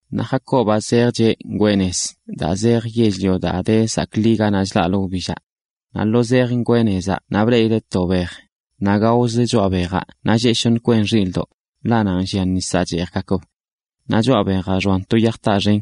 Naꞌ Jacobaꞌ zejcheꞌ ngwee nez daa zejə yell-lio daa de zaakli ganaꞌ chlaꞌlə wbillaꞌ. Naꞌ lo zejə ngwee nezaꞌ naꞌ bleꞌileꞌ to bej, naꞌ gaozə choꞌa bejaꞌ naꞌ lleꞌ shoṉə kwen xilꞌdoꞌ, ḻaꞌ nanꞌ llia nisaꞌ cheejgakb. Naꞌ choꞌa bejaꞌ xoan to yaj taa xen.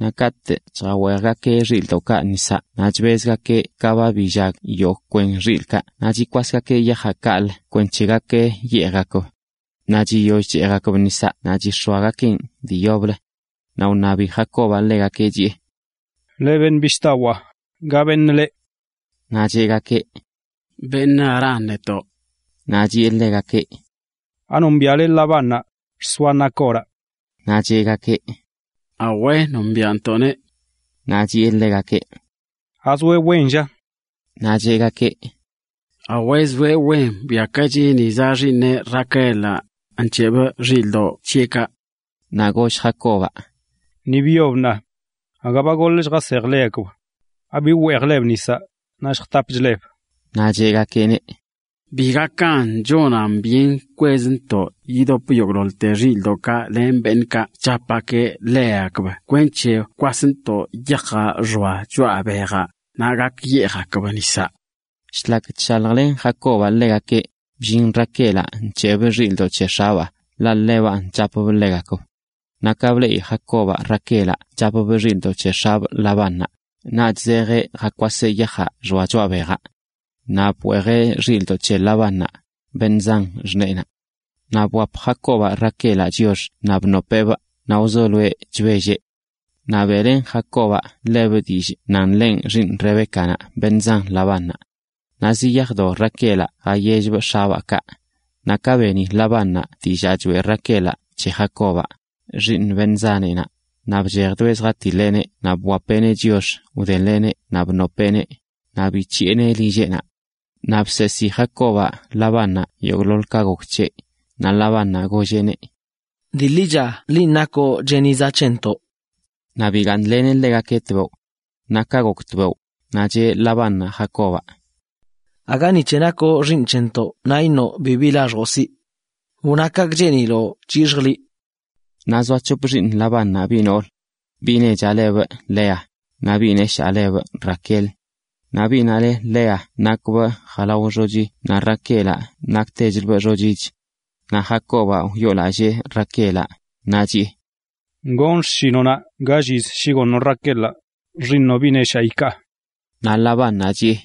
Naꞌ katꞌ chjaweejgakeꞌ xilꞌdoꞌkaꞌ nisaꞌ naꞌ chbezgakeꞌ ka ba billag yogꞌ kwen xilꞌkaꞌ naꞌ chikwasgakeꞌ yajaꞌ kaꞌlə kwenc̱he gak yeejgakb. Naꞌ chiyoll cheejgakb nisaꞌ naꞌ chix̱oagakeꞌn dii yoblə. Naꞌ wṉabi Jacobaꞌ ḻegakeꞌ, chiꞌe: ―Leꞌ beṉꞌ bishꞌdawaa, ¿ga beṉꞌ leꞌ? Naꞌ cheꞌgakeꞌ: ―Beṉꞌ Harán netoꞌ. Naꞌ chiꞌe ḻegakeꞌ: ―¿Anombiaꞌle Labánnaꞌ, xsoa Nacoraꞌ? Naꞌ cheꞌgakeꞌ: ―Awe, nombiantoꞌneꞌ. Naꞌ chiꞌe ḻegakeꞌ: ―¿Azoeꞌ wen, lla? Naꞌ cheꞌgakeꞌ: ―Awe, zoeꞌ wen. Bwiakachi, ni zaꞌ xiiṉeꞌ, Raquelaꞌ, nc̱heꞌbꞌ xilꞌdoꞌ c̱heꞌkaꞌ. Naꞌ goll Jacobaꞌ: ―Ni byob ṉaa. Aga ba goḻ lljasejle ḻegakb. ¿Abi wweejlegakb nisaꞌ, naꞌ lljtapchleb? Naꞌ cheꞌgakeꞌneꞌ: ―Bi gakan. Chonan byen kwezntoꞌ yidop yogꞌḻoḻ xilꞌdoꞌkaꞌ len beṉꞌkaꞌ chapgakeꞌ ḻegakb kwenc̱he wkwasntoꞌ yajaꞌ xoa choꞌa bejaꞌ, naꞌ gak yeejgakb nisaꞌ. Shlak chshaljlen Jacobaꞌ ḻegakeꞌ, bllin Raquelaꞌ nc̱heꞌbꞌ xilꞌdoꞌ c̱he x̱abaa, ḻaꞌ ḻebanꞌ chapbꞌ ḻegakb. Naꞌ ka bleꞌi Jacobaꞌ Raquelaꞌ chapbꞌ xilꞌdoꞌ c̱he x̱abꞌ Labánnaꞌ, naꞌch zejeꞌ jakwaseꞌ yajaꞌ xoa choꞌa bejaꞌ. Naꞌ bweejeꞌ xilꞌdoꞌ c̱he Labánnaꞌ, beṉꞌ zan xṉeenaꞌ. Naꞌ bwap Jacobaꞌ Raquelaꞌ chiox naꞌ bnopeꞌbꞌ naꞌ wzoloeꞌ chbelleꞌ. Naꞌ beꞌlen Jacobaꞌ ḻebꞌ dillꞌ nan ḻenꞌ xiiṉ Rebécanaꞌ, beṉꞌ zan Labánnaꞌ. Naꞌ ziyajdo Raquelaꞌ jayellbꞌ x̱abaa kaꞌ. Naꞌ ka beni Labánnaꞌ dillaa choeꞌ Raquelaꞌ c̱he Jacobaꞌ, xiiṉ beṉꞌ zaneꞌnaꞌ, naꞌ bchejdoeꞌ zjatiḻeꞌneꞌ naꞌ bwapeꞌneꞌ chiox wdeḻeꞌneꞌ naꞌ bnopeꞌneꞌ, naꞌ bic̱hiꞌeneꞌ lilleꞌnaꞌ. Naꞌ bseesi Jacobaꞌ Labánnaꞌ yogꞌḻoḻ ka gok c̱heꞌ. Naꞌ Labánnaꞌ golleꞌneꞌ: “Dii ḻicha liꞌ nakoꞌ cheniza c̱hentoꞌ.” Naꞌ bigaaṉleneꞌ ḻegakeꞌ tbeoꞌ. Naꞌ ka gok tbeoꞌ, naꞌ cheꞌ Labánnaꞌ Jacobaꞌ: ―Aga ni c̱he nakoꞌ xiiṉ c̱hentoꞌ naꞌ iṉoꞌ bibi laxjoꞌ siꞌ. Wna kaꞌkꞌ cheeniloꞌ c̱hixjꞌ liꞌ. Naꞌ zoa c̱hop xiiṉ Labánnaꞌ, biꞌ noolə. Biꞌ nechaꞌ lebꞌ Lea, naꞌ biꞌ neshaa lebꞌ Raquel. Naꞌ biꞌnaꞌ le Lea nakbꞌ jalao xochi naꞌ Raquelaꞌ naktechlbꞌ xochich. Naꞌ Jacobaꞌ wyoolallee Raquelaꞌ, naꞌ chiꞌe: ―Gonꞌ xshinoꞌnaꞌ gall yiz shi goṉoꞌ Raquelaꞌ, xiiṉoꞌ biꞌ neshaa, ikaa. Naꞌ Labánnaꞌ chiꞌe: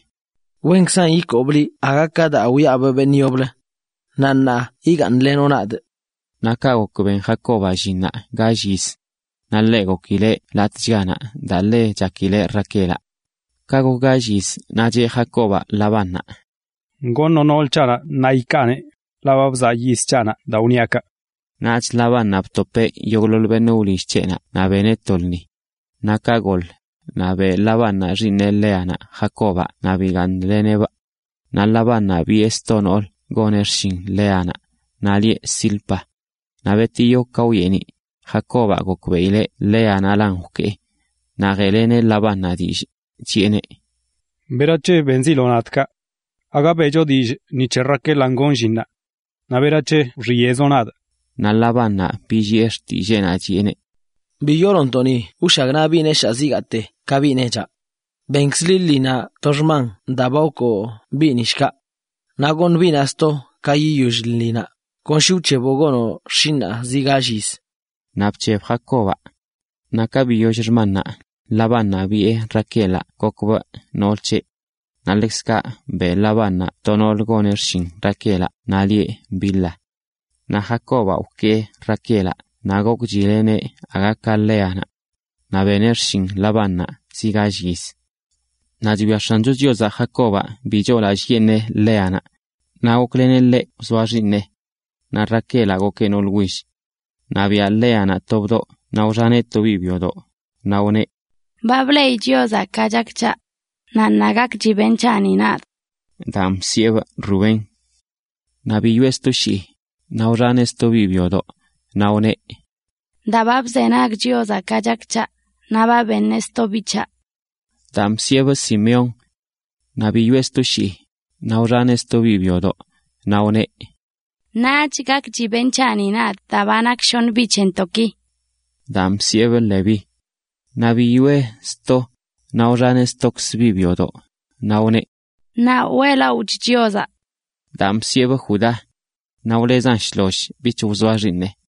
―Wenkzan ikoobꞌ liꞌ aga ka daa wiaꞌbꞌ beṉꞌ yoblə. Naꞌ ṉaa igaaṉlenoꞌ nadꞌ. Naꞌ kaꞌ gok ben Jacobaꞌ llinnaꞌ gall yiz, naꞌ gokileꞌ latꞌchganaꞌ daa ḻe chakileꞌ Raquelaꞌ. Ka gok gall yiz, naꞌ cheꞌ Jacobaꞌ Labánnaꞌ: ―Goṉoꞌ nool c̱haꞌnaꞌ ṉaa ikaaneꞌ, ḻaꞌ ba bzaa yiz c̱haꞌnaꞌ daa wṉiaꞌ kaꞌ. Naꞌch Labánnaꞌ btopeꞌ yogꞌḻoḻ beṉꞌ wlill c̱heꞌnaꞌ naꞌ beneꞌ to lṉi. Naꞌ ka gol, naꞌ beꞌ Labánnaꞌ xiiṉe Léanaꞌ Jacobaꞌ naꞌ bigaaṉleneꞌbꞌ. Naꞌ Labánnaꞌ biꞌe sto noolə goneꞌ xshin Léanaꞌ, naꞌ lieꞌ Zilpa. Naꞌ betiyo, ka wyeeniꞌ, Jacobaꞌ gokbeꞌileꞌ Léanaꞌlan wkee. Naꞌ jeꞌleneꞌ Labánnaꞌ dillꞌ, chiꞌeneꞌ: ―¿Berac̱he benziloꞌ nadꞌ kaꞌ? ¿Agaga beꞌcho dillꞌ ni c̱he Raquelanꞌ gonꞌ llinnaꞌ? Naꞌ ¿berac̱he wxiyeꞌzoꞌ nadꞌ? Naꞌ Labánnaꞌ billiꞌe xtilleenaꞌ, chiꞌeneꞌ: ―Bi yoolontoꞌ ni wshagnaꞌ biꞌ neshaa zigaate ka biꞌ nechaꞌ. Benkz liꞌ lṉinaꞌ to xman daa ba wkoo biꞌni shkaꞌ. Naꞌ goṉꞌ biꞌnaꞌ sto ka yiyoll lṉinaꞌ, kon shi wc̱heboꞌ gonoꞌ xshinꞌnaꞌ zi gall yiz. Naꞌ bc̱heb Jacobaꞌ. Naꞌ ka biyoll xmannaꞌ, Labánnaꞌ biꞌe Raquelaꞌ gokbꞌ nool c̱heꞌ. Naꞌ ḻekzkaꞌ beꞌ Labánnaꞌ to noolə goneꞌ xshin Raquelaꞌ, naꞌ lieꞌ Bilha. Naꞌ Jacobaꞌ wkee Raquelaꞌ naꞌ gokchileꞌneꞌ aga ka Léanaꞌ. Naꞌ beneꞌ xshin Labánnaꞌ zi gall yiz. Naꞌ chwia X̱ancho Chiozaꞌ Jacobaꞌ bi choolallꞌyeṉeꞌ Léanaꞌ, naꞌ gokleneꞌ ḻeꞌ wzoa xiiṉeꞌ. Naꞌ Raquelaꞌ gokeꞌ noolə will. Naꞌ biaꞌ Léanaꞌ to bdoꞌ naꞌ wxaneꞌ to biꞌ byodoꞌ, naꞌ wneꞌ: “Ba bleꞌi Chiozaꞌ ka chak c̱haꞌ. Naꞌ ṉaa gakchi beṉꞌ c̱haꞌni nadꞌ.” Daan bsiꞌebꞌ Rubén. Naꞌ biyoꞌe sto shii, naꞌ wxaneꞌ sto biꞌ byodoꞌnaꞌ, naꞌ wneꞌ: “Daa ba bzenag Chiozaꞌ ka chak c̱haꞌ, naꞌ ba beneꞌ sto biꞌ c̱haꞌ.” Daan bsiꞌebꞌ Simeón. Naꞌ biyoꞌe sto shii, naꞌ wxaneꞌ sto biꞌ byodoꞌ, naꞌ wneꞌ: “Ṉaach gakchi beṉꞌ c̱haꞌni nadꞌ daa ba nak shoṉ biꞌ c̱hentoꞌki.” Daan bsiꞌebꞌ Leví. Naꞌ biyoꞌe sto, naꞌ wxaneꞌ stokzə biꞌ byodoꞌ, naꞌ wneꞌ: “Ṉaa weꞌlaꞌochꞌ Chiozaꞌ.” Daan bsiꞌebꞌ Judá. Naꞌ wlezan shloll bich wzoa xiiṉeꞌ.